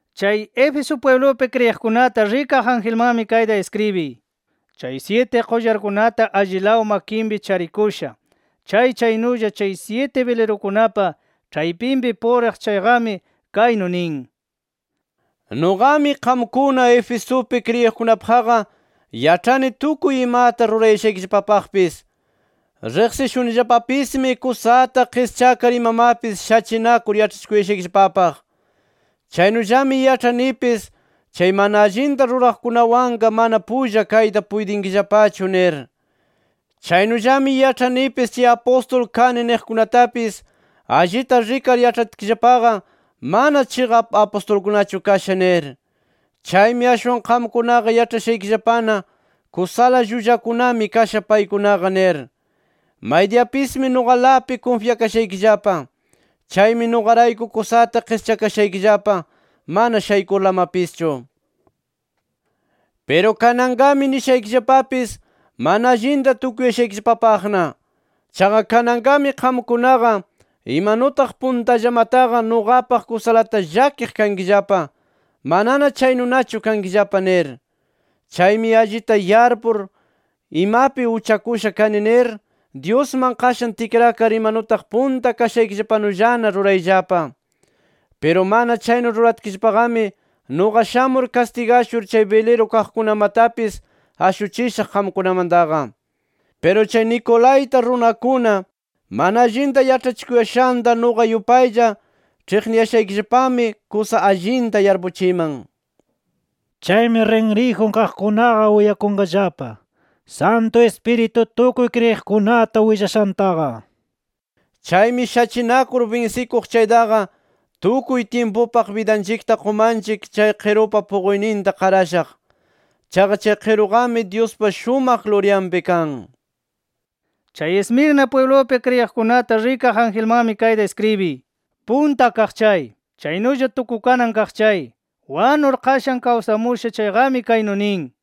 “Chay Éfeso pwiblupi kriyiqkunata rikaq angelmanmi kayta iskribiy: Chay syiti qullarkunata allilaw makinpi charikusha chay, chaynulla chay syiti bilirukunapa ĉhaypinpi puriq chayqami kaynu nin: Nuqami, qamkuna Efesupi kriyiqkunapaqqa yaĉhani tukuy imata rurayashaykillapapaqpis. Riqsishunillapapismi kusata qischakar imamapis shachinakur yaĉhachikuyashaykillapapaq. Chaynullami yaĉhanipis, chay mana allinta ruraqkunawanqa mana pulla kayta puytinkillapachu nir. Chaynullami yaĉhanipis chay apustul kani niqkunatapis allita rikar yaĉhatkillapaqa mana chiqap apustulkunachu kasha nir. Chaymi ashwan qamkunaqa yaĉhashaykillapana kusala llullakunami kasha paykunaqa nir. Maydiyapismi nuqalapi kunfyakashaykillapa. Chaymi nuqarayku kusata qischakashaykillapa, mana shaykurlamapischu. Piru kananqami nishaykillapapis mana allinta tukuyashaykillapapaqna: Chaqa kananqami qamkunaqa imanutaq puntallamataqa nuqapaq kusalata llakiq kankillapa manana chaynunachu kankillapa nir. Chaymi allita yarpur, imapi uchakusha kani nir, Dyusman qashan tikrakar imanutaq punta kashaykillapanullana rurayllapa. Piru mana chaynu ruratkillapaqami nuqa shamur kastigashur chay biliru kaqkunamatapis ashuchishaq qamkunamantaqa. Piru chay Nicolaíta runakuna mana allinta yaĉhachikuyashanta nuqa yupaylla ĉhiqniyashaykillapami kusa allinta yarpuchiman. ¡Chaymi rinriyjun kaqkunaqa uyakunqallapa, Santu Ispiritu tukuy kriyiqkunata willashantaqa! Chaymi shachinakur binsikuq chaytaqa, tukuy tyimpupaq bidanchikta qumanchik chay qirupa puquyninta qarashaq. Chaqa chay qiruqami Dyuspa shumaq luryanpi kan. “Chay Esmirna pwiblupi kriyiqkunata rikaq angelmanmi kayta iskribiy: Punta Kaq chay, chaynulla Tukukanan Kaq chay, wanur qashan kawsamusha chayqami kaynu nin: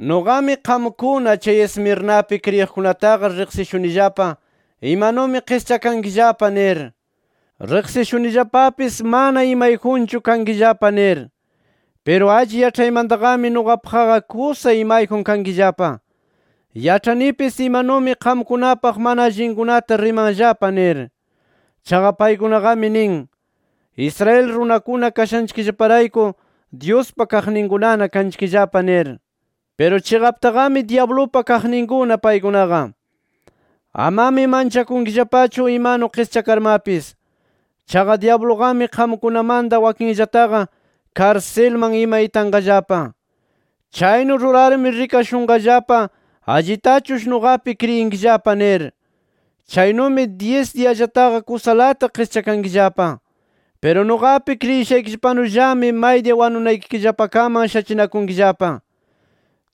Nuqami, qamkuna chay Esmirnapi kriyiqkunataqa riqsishunillapa imanumi qischakankillapa nir. Riqsishunillapapis mana imayjunchu kankillapa nir. Piru alli yaĉhaymantaqami nuqapaqqa kusa imayjun kankillapa. Yaĉhanipis imanumi qamkunapaq mana allinkunata rimanllapa nir. Chaqa paykunaqami nin: Israel runakuna kashanchikllaparayku Dyuspa kaqninkunana kanchikllapa nir. Piru chiqaptaqami dyablupa kaqninkuna paykunaqa. Amami manchakunkillapachu imanu qischakarmapis. Chaqa dyabluqami qamkunamanta wakinllataqa, karsilman ima itanqallapa. Chaynu rurarmi rikashunqallapa allitachush nuqapi kriyinkillapa nir. Chaynumi dyis diyallataqa kusalata qischakankillapa. Piru nuqapi kriyishaykillapanullami, maydiya wanunaykillapakaman shachinakunkillapa.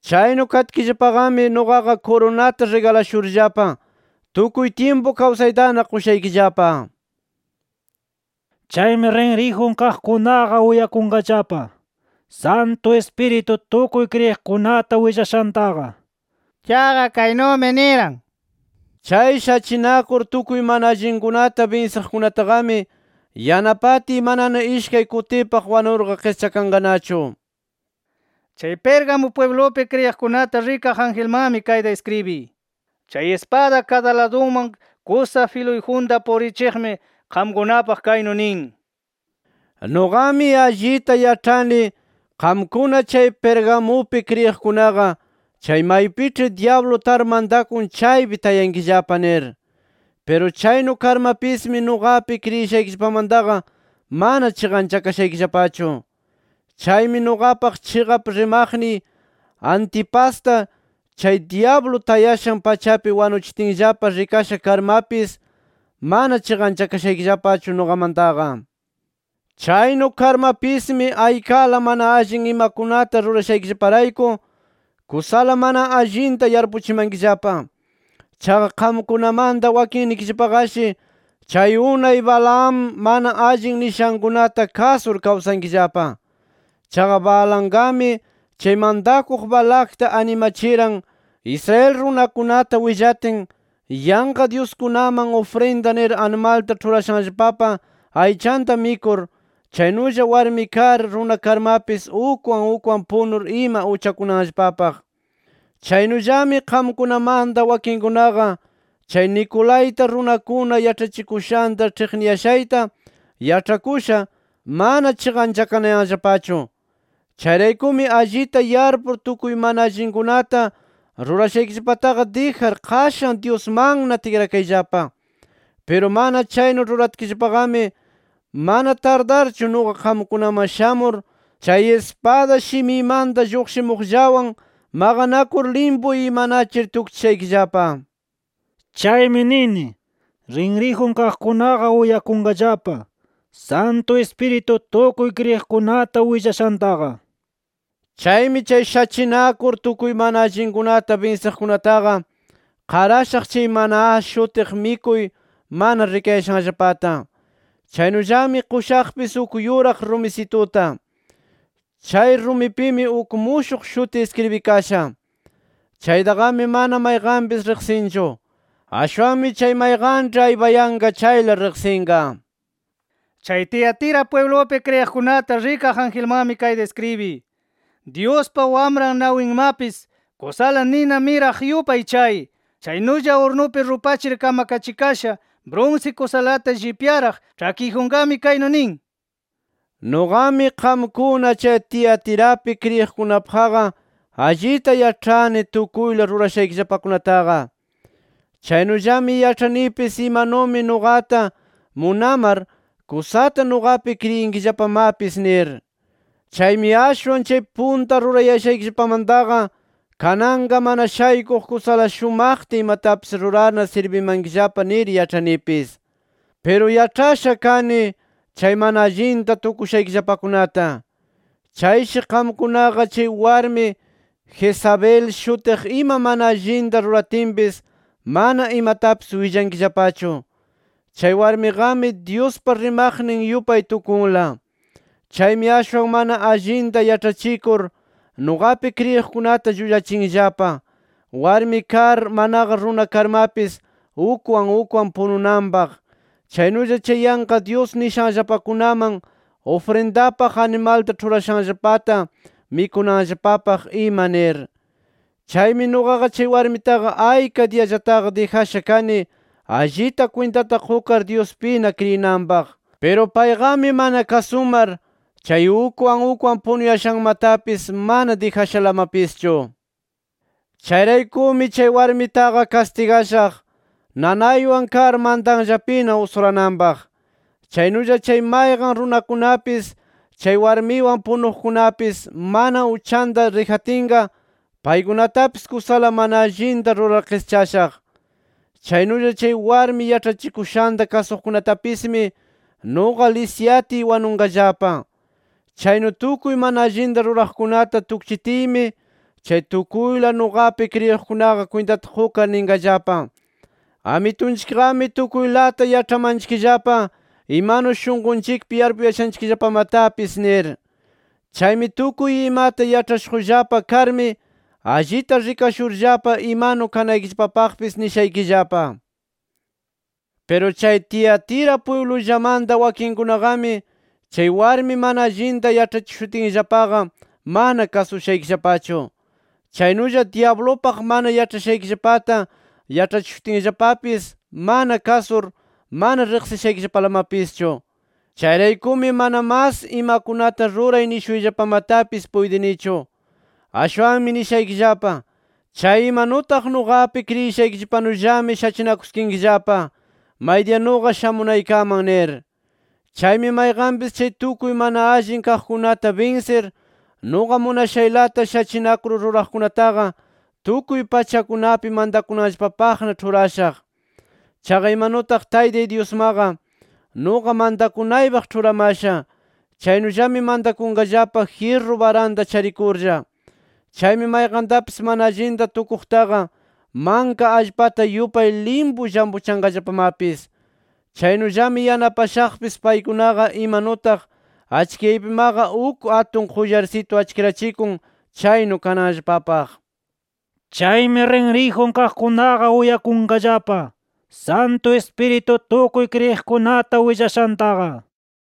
Chaynu katkillapaqami nuqaqa kurunata rigalashurllapa tukuy tyimpu kawsaytana qushaykillapa. ¡Chaymi rinriyjun kaqkunaqa uyakunqallapa, Santu Ispiritu tukuy kriyiqkunata willashantaqa! Chaqa kaynumi niran: ‘Chay shachinakur tukuy mana allinkunata binsiqkunataqami, yanapatiy manana ishkay kutipaq wanurqa qischakanqanachu’ nir. “Chay Pérgamo pwiblupi kriyiqkunata rikaq angelmanmi kayta iskribiy: Chay ispada kadaladunman kusa filuyjunta purichiqmi, qamkunapaq kaynu nin: Nuqami allita yaĉhani qamkuna chay Pergamupi kriyiqkunaqa chay maypiĉhi dyablu tar mantakun chaypi tayankillapa nir. Piru chaynu karmapismi, nuqapi kriyishaykillapamantaqa mana chiqanchakashaykillapachu. Chaymi nuqapaq chiqap rimaqniy Antipasta chay dyablu tayashan pachapi wanuchitinllapa rikasha karmapis, mana chiqanchakashaykillapachu nuqamantaqa. Chaynu karmapismi aykala mana allin imakunata rurashaykillaparayku kusala mana allinta yarpuchimankillapa. Chaqa qamkunamanta wakinnikillapaqashi, chay unay Balaam mana allin nishankunata kasur kawsankillapa. Chaqa Balaamqami chay mantakuq Balacta animachiran Israel runakunata willatin, yanqa dyuskunaman ufrinda nir animalta ĉhurashanllapapa aychanta mikur, chaynulla warmi kar, runa karmapis ukwan ukwan punur ima uchakunanllapapaq. Chaynullami qamkunamanta wakinkunaqa chay Nicolaíta runakuna yaĉhachikushanta [ĉhiqniyashayta] yaĉhakusha, mana chiqanchakanayanllapachu. Chayraykumi allita yarpur tukuy mana allinkunata rurashaykillapataqa dijar qashan Dyusmanna tikrakayllapa. Piru mana chaynu ruratkillapaqami mana tardarchu nuqa qamkunaman shamur, chay ispada shimiymanta lluqshimuqllawan maqanakur limpu imanachir tukchishaykillapa. Chaymi nini: ¡Rinriyjun kaqkunaqa uyakunqallapa, Santu Ispiritu tukuy kriyiqkunata willashantaqa! Chaymi chay shachinakur tukuy mana allinkunata binsiqkunataqa, qarashaq chay ‘maná’ shutiq mikuy mana rikayashanllapata. Chaynullami qushaqpis uk yuraq rumisituta. Chay rumipimi uk mushuq shuti iskribikasha. Chaytaqami mana mayqanpis riqsinchu. Ashwanmi chay mayqanĉhi aypayanqa chayla riqsinqa. “Chay Tiatira pwiblupi kriyiqkunata rikaq angelmanmi kayta iskribiy: Dyuspa Wamran nawinmapis kusala nina miraq yupay chay, chaynulla urnupi rupachir kamakachikasha brunsi kusalata llipyaraq ĉhakiyjunqami kaynu nin: Nuqami, qamkuna chay Tiatirapi kriyiqkunapaqqa allita yaĉhani tukuyla rurashaykillapakunataqa. Chaynullami yaĉhanipis imanumi nuqata munamar, kusata nuqapi kriyinkillapamapis nir. Chaymi ashwan chay punta rurayashaykillapamantaqa kananqa mana shaykuq kusala shumaqta imatapis rurarna sirbimankillapa nir yaĉhanipis. Piru yaĉhasha kani chay mana allinta tukushaykillapakunata. Chayshi qamkunaqa, chay warmi Jezabel shutiq ima mana allinta ruratinpis mana imatapis willankillapachu. Chay warmiqami, Dyuspa rimaqnin yupay tukunla. Chaymi ashwan mana allinta yaĉhachikur, nuqapi kriyiqkunata llullachinllapa, warmi kar manaqa runa karmapis ukwan ukwan pununanpaq, chaynulla chay yanqa dyus nishanllapakunaman ufrindapaq animalta ĉhurashanllapata mikunanllapapaq ima nir. Chaymi nuqaqa chay warmitaqa ayka diyallataqa dijasha kani, allita kwintata qukar Dyuspina kriyinanpaq. Piru payqami mana kasumar, chay ukwan ukwan punuyashanmatapis mana dijashalamapischu. Chayraykumi chay warmitaqa kastigashaq, nanaywan kar mantanllapina usurananpaq. Chaynulla chay mayqan runakunapis chay warmiwan punuqkunapis, mana uchanta dijatinqa paykunatapis kusala mana allinta rurar qischashaq. Chaynulla chay warmi yaĉhachikushanta kasuqkunatapismi nuqa lisyatiy wanunqallapa. Chaynu tukuy mana allinta ruraqkunata tukchitiymi chay tukuyla nuqapi kriyiqkunaqa kwintata qukar ninqallapa: ‘Amitunchikqami tukuylata yaĉhamanchikllapa imanu shunqunchikpi yarpuyashanchikllapamatapis’ nir. Chaymi tukuy imata yaĉhashuqllapa karmi, allita rikashurllapa imanu kanaykillapapaqpis nishaykillapa. Piru chay Tiatira pwiblullamanta wakinkunaqami chay warmi mana allinta yaĉhachishutinllapaqa mana kasushaykillapachu. Chaynulla dyablupaq mana yaĉhashaykillapata yaĉhachishutinllapapis mana kasur, mana riqsishaykillapalamapischu. Chayraykumi mana mas imakunata ruray nishuyllapamatapis puytinichu. Ashwanmi nishaykillapa: Chay imanutaq nuqapi kriyishaykillapanullami shachinakuskinkillapa, maydiya nuqa shamunaykaman nir. Chaymi mayqanpis chay tukuy mana allin kaqkunata binsir nuqa munashaylata shachinakur ruraqkunataqa, tukuy pachakunapi mantakunanllapapaqna ĉhurashaq. Chaqa imanutaq Taytay Dyusmaqa, nuqa mantakunaypaq ĉhuramasha, chaynullami mantakunqallapa jyirru baranta charikurlla. Chaymi mayqantapis mana allinta tukuqtaqa manka allpata yupay limpu llampuchanqallapamapis. Chaynullami yanapashaqpis paykunaqa imanutaq achkiyaypimaqa uk atun qullarsitu achkirachikun chaynu kananllapapaq. ¡Chaymi rinriyjun kaqkunaqa uyakunqallapa, Santu Ispiritu tukuy kriyiqkunata willashantaqa!